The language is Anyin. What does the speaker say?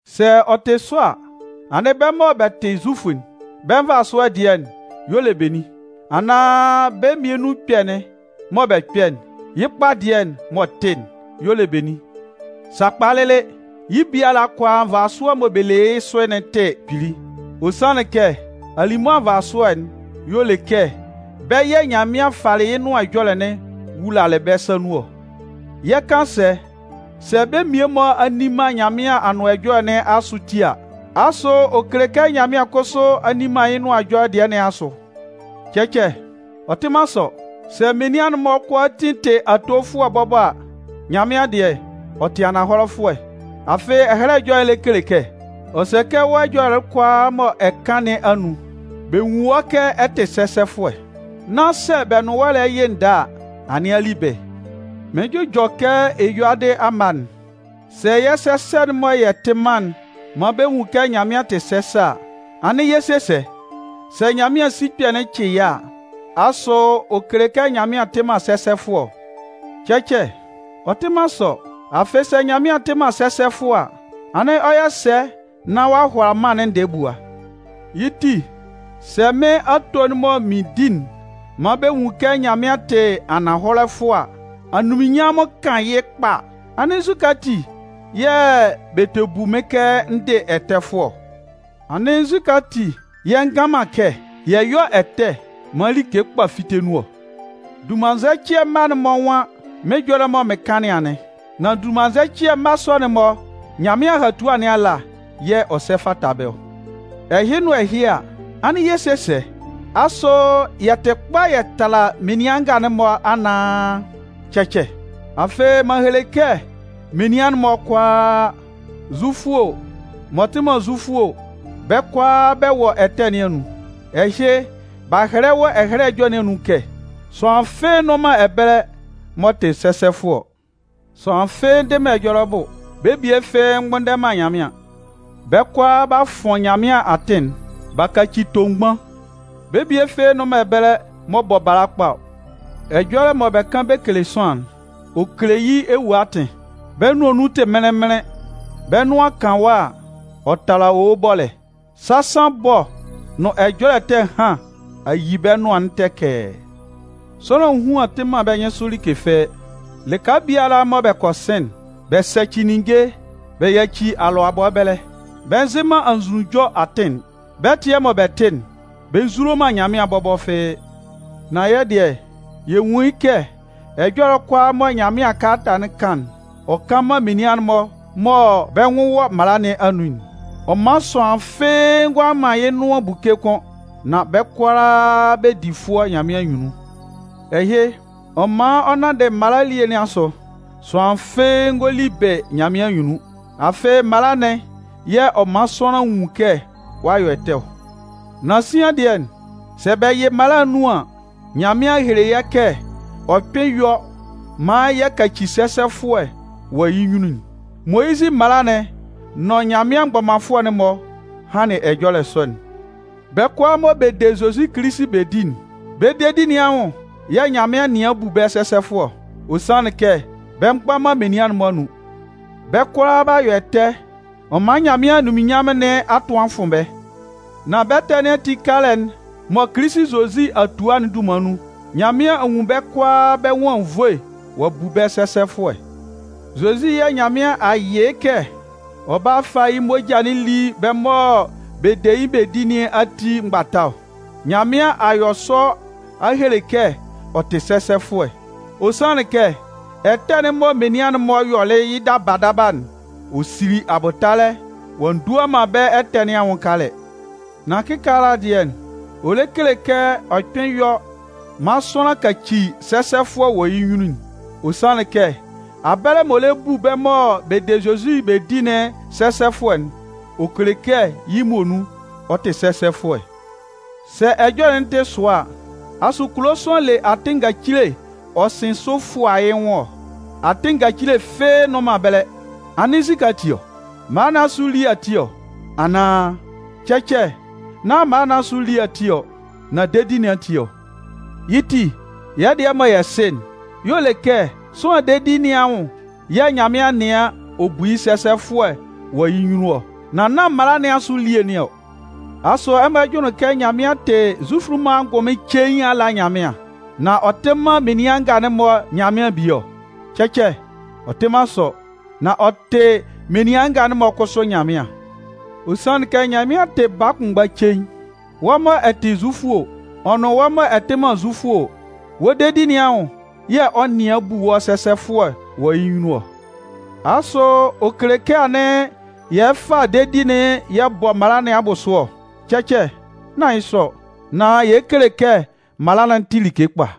Sɛ ɔ tɩ sɔ a, anɩn bɛ́ mɔ bɛ tɩ Zufʋ'n, bɛ́ nvasʋɛ dɩɛ y'ɔ le benin? Anaan bɛ́ mmian nun ɛkpɛ'n mɔ bɛ kpɛ'n, yɩ́ kpa dɩɛ m'ɔ tɩ'n y'ɔ le benin? Sakpa lɩlɩ, yɩ́ biala kʋalaa nvasʋɛ mɔ bɛ le yɩ́ sʋ'n tɩ kpili! Ɔ sanlɩn kɛ alimʋa nvasʋɛ'n y'ɔ le kɛ bɛ́ yɛ̂ Nyanmɩan falɩ yɩ́ nʋan ɛjɔlɛ'n wulalɩ bɛ́ sa nun ɔ. Yɛ 'kan sɛ? Sɛ bɛ́ mmie-mɔ a nni man Nyanmɩan Anʋan Ɛjɔlɛ nɩn asʋ ati a, asʋ ɔ kele kɛ Nyanmɩan kʋsʋ a nni man yɩ́ Nʋan Ɛjɔlɛ dɩɛ nɩn asʋ? Cɛcɛ! Ɔ tɩ man sɔ. Sɛ menian'n-mɔ kʋalaatin tɩ atofʋɛ bɔbɔ a, Nyanmɩan dɩɛ, ɔ tɩ ananhɔlɛfʋɛ. Afɩ Ɛhɛlɛ Ɛjɔlɛ lɛ kele kɛ: Ɔ sɛ kɛ wɔ́ ɛjɔlɛ'n kʋalaa mɔ ɛ kan nɩn anun, bɛ nwún wɔ́ kɛ ɛ tɩ sɛsɛfʋɛ nán sɛ bɛ nʋn wɔ́ lɛ yɩ ndɛɛ a, anɩn a li bɩ. Mɩɩn jʋjɔ kɛ eyuadɩ amma'n. Sɛ yɛ́ sɛsɛ'n mɔ yɛ tɩ man'n man bɛ nwun kɛ Nyanmɩan tɩ sɛsɛ a, anɩn yɛ 'se sɛ? Sɛ Nyanmɩan sikpɛ'n cɩ yɛ́ a, asʋ ɔ kele kɛ Nyanmɩan tɩ man sɛsɛfʋɛ ɔ? Cɛcɛ! Ɔ tɩ man sɔ. Afɩ, sɛ Nyanmɩan tɩ man sɛsɛfʋɛ a, anɩn ɔ 'yɔ sɛ nán ɔ'a hʋala mân'n ndɛɛ bua? Yɩ́ ti, sɛ mɩ́n ato'n mɔ mɩn di'n man bɛ nwun kɛ Nyanmɩan tɩ ananhɔlɛfʋɛ, anunminnyanmʋn kan yɩ́ kpa a, anɩn nzukɛ ati yɛ̂ bɛ tɛ bu mɩ́n kɛ n dɩ ɛtɛfʋɛ ɔ? Anɩn nzukɛ ati yɛ̂ yɛ ngan man kɛ: “Yɛ yɔ́ ɛtɛ maan like kpa fíte nun ɔ?” Dunmannzɛcɩɛ mma'n-mɔ nwan mɩ́n ɛjɔlɛ mɔ mɩ́n kan nɩn anɩn. Nan dunmannzɛcɩɛ mma sɔ'n-mɔ, Nyanmɩan ahatua nɩn ala yɛ̂ ɔ sɛ fata bɛ́ ɔ. Ɛhɩ nʋn ɛhɩ a, anɩn yɛ 'se sɛ? Asʋ yɛ tɩ kpa yɛ tala menian nga'n-mɔ anaan? Cɛcɛ. Afɩ, m'an hele kɛ menian'n-mɔ kʋalaa, Zufʋ o, m'ɔ tɩ man Zufʋ o, bɛ́ kʋalaa bɛ wɔ ɛtɛ nɩn anun. Ɛhɩ b'a hɛlɛ wɔ Ɛhɛlɛ Ɛjɔlɛ nɩn anun kɛ: Sʋanlan fɩ́ɩ́ nnʋn man ɛbɛlɛ m'ɔ tɩ sɛsɛfʋɛ ɔ. Sʋanlan fɩ́ɩ́ ndɩ man ɛjɔlɛ bʋ, bɛ́ bie fɩ́ɩ́ mgbʋnndɛ man Nyanmɩan. Bɛ́ kʋalaa b'a fʋn Nyanmɩan atɩn'n, b'a kaci tomgban. Bɛ́ bie fɩ́ɩ́ nnʋn man ɛbɛlɛ m'ɔ bɔ bala kpa ɔ. Ɛjɔlɛ mɔ bɛ kan bɛ kele sʋanlan'n, ɔ kele yɩ́ ewue atɩn. Bɛ́ nʋan nun tɩ mɩnlɩn-mɩnlɩn. Bɛ́ nʋan kan wɔ́ a, ɔ tala owo bɔlɛ. Sasan ɛbɔ nʋn ɛjɔlɛ ɛtɛ ɛhan a yi bɛ́ nʋan'n tɛkɛɛ. Sʋanlan ehuan tɩ man bɛ́ nyɩnsʋ like fɩ́ɩ́. Lɩka biala mɔ bɛ kɔ sɩn'n, bɛ sɛcɩ ninnge bɛ yaci alʋabɔ ɛbɛlɛ. Bɛ nzɩ man anzʋnunjɔ atɩn'n. Bɛ́ ɛtɩɛ mɔ bɛ tɩ'n, bɛ nzulo man Nyanmɩan bɔbɔ fɩ́ɩ́. Nan yɛ́ dɩɛ, yɛ nwun yɩ́ kɛ ɛjɔlɛ kʋalaa mɔ Nyanmɩan mala kalata'n kan'n, ɔ kan man menian'n-mɔ mɔ bɛ́ nwʋn wɔ mala nɩn anun'n. Ɔ man sʋanlan fɩ́ɩ́ ngʋala man yɩ́ nʋan buke kʋ́n, nan bɛ́ kʋalaa bɛ di fʋɔ Nyanmɩan anyunnun. Ɛhɩ, ɔ man ɔ nanndɩ mala elie nɩn asʋ, sʋanlan fɩ́ɩ́ ngɔ li bɩ Nyanmɩan anyunnun. Afɩ, mala'n yɛ̂ ɔ man sʋanlan nwun kɛ ɔ'a yɔ ɛtɛ ɔ. Nan sian dɩɛ, sɛ bɛ yɩ mala'n nun an, Nyanmɩan a hele yɛ́ kɛ ɔ kpɩn yɔ maan yɛ kaci sɛsɛfʋɛ wɔ yɩ́ nyunnun'n. Moyizɩ mala'n nʋn Nyanmɩan mgbɔmanfʋɛ'n-mɔ hanlɩn ɛjɔlɛ sɔ'n. Bɛ́ kʋalaa mɔ bɛ de Zozi Kilisi bɛ di'n, bɛ́ dedi nɩn anwʋn yɛ̂ Nyanmɩan nɩan bu bɛ́ sɛsɛfʋɛ ɔ. Ɔ sanlɩn kɛ bɛ mgba man menian'n-mɔ anun, bɛ́ kʋalaa b'a yɔ ɛtɛ, ɔ man Nyanmɩan anunminnyanmʋn nɩn a tʋ a fʋn bɛ́. Nan bɛ́ ɛtɛ nɩn ati kalɛ'n mɔ Kilisi Zozi a tua'n dunman nun, Nyanmɩan a nwun bɛ́ kʋalaa bɛ́ nwʋn anwunnvoe ɔ'a bu bɛ́ sɛsɛfʋɛ. Zozi yɛ̂ Nyanmɩan a yɩ yɩ́ kɛ ɔ bála fá yɩ́ moja'n lí bɛ́ mɔ bɛ de yɩ́ bɛ di nɩn ati mgbata ɔ. Nyanmɩan a yɔ sɔ ɔ a hele kɛ ɔ tɩ sɛsɛfʋɛ. Ɔ sanlɩn kɛ ɛtɛ'n mɔ menian'n-mɔ yɔlɩ yɩ́ daba daba'n, ɔ sili abʋtalɛ, ɔ'a ndua man bɛ́ ɛtɛ nɩn anwʋn kalɛ. Nan kɩkaala dɩɛ, ɔ lɛ kele kɛ ɔ kpɩn yɔ maan sʋanlan kaci sɛsɛfʋɛ wɔ yɩ́ nyunnun'n. Ɔ sanlɩn kɛ abɛlɛ m'ɔ lɛ bu bɛ́ mɔ bɛ de Zozi bɛ di'n sɛsɛfʋɛ'n, ɔ kele kɛ yɩ́ muonun ɔ tɩ sɛsɛfʋɛ. Sɛ ɛjɔlɛ'n tɩ sʋa a, asʋ kulo sʋanlan le atɩn ngacile ɔ sɩn sʋ fʋa yɩ́ nwʋn ɔ? Atɩn ngacile fɩ́ɩ́ nnʋn man ɛbɛlɛ. Anɩn nzukɛ ati ɔ? Mala nɩn asʋ elie ati ɔ, anaan? Cɛcɛ, nán mala nɩn asʋ elie ati ɔ, nan dedi nɩn ati ɔ. Yɩ́ ti, yɛ́ dɩɛ mɔ yɛ sɩ'n, y'ɔ le kɛ sʋanlan dedi nɩn anwʋn yɛ̂ Nyanmɩan nɩan ɔ bu yɩ́ sɛsɛfʋɛ wɔ yɩ́ nyunnun ɔ. Nan nán mala nɩn asʋ elie nɩn ɔ. Asʋ ɛmɔ jʋnlɩn kɛ Nyanmɩan tɩ Zufʋ'n-mɔ angʋnmɩn cein ala Nyanmɩan, nan ɔ tɩ man menian nga'n-mɔ Nyanmɩan bie ɔ? Cɛcɛ, ɔ tɩ man sɔ. Nan ɔ tɩ menian nga'n-mɔ kʋsʋ Nyanmɩan. Ɔ sanlɩn kɛ Nyanmɩan tɩ baa kʋnmgba cein. Wɔ́ mɔ ɛ tɩ Zufʋ o, ɔ nʋn wɔ́ mɔ ɛ tɩ man Zufʋ o, wɔ́ dedi nɩn anwʋn yɛ̂ ɔ 'nɩan bu wɔ́ sɛsɛfʋɛ wɔ yɩ́ nyunnun ɔ. Asʋ ɔ kele kɛ anɩn yɛ lɛ fa dedi'n yɛ bɔ mala nɩn abʋsʋ ɔ? Cɛcɛ, nán yɩ́ sɔ ɔ. Nan yɛ lɛ kele kɛ mala'n tɩ like kpa.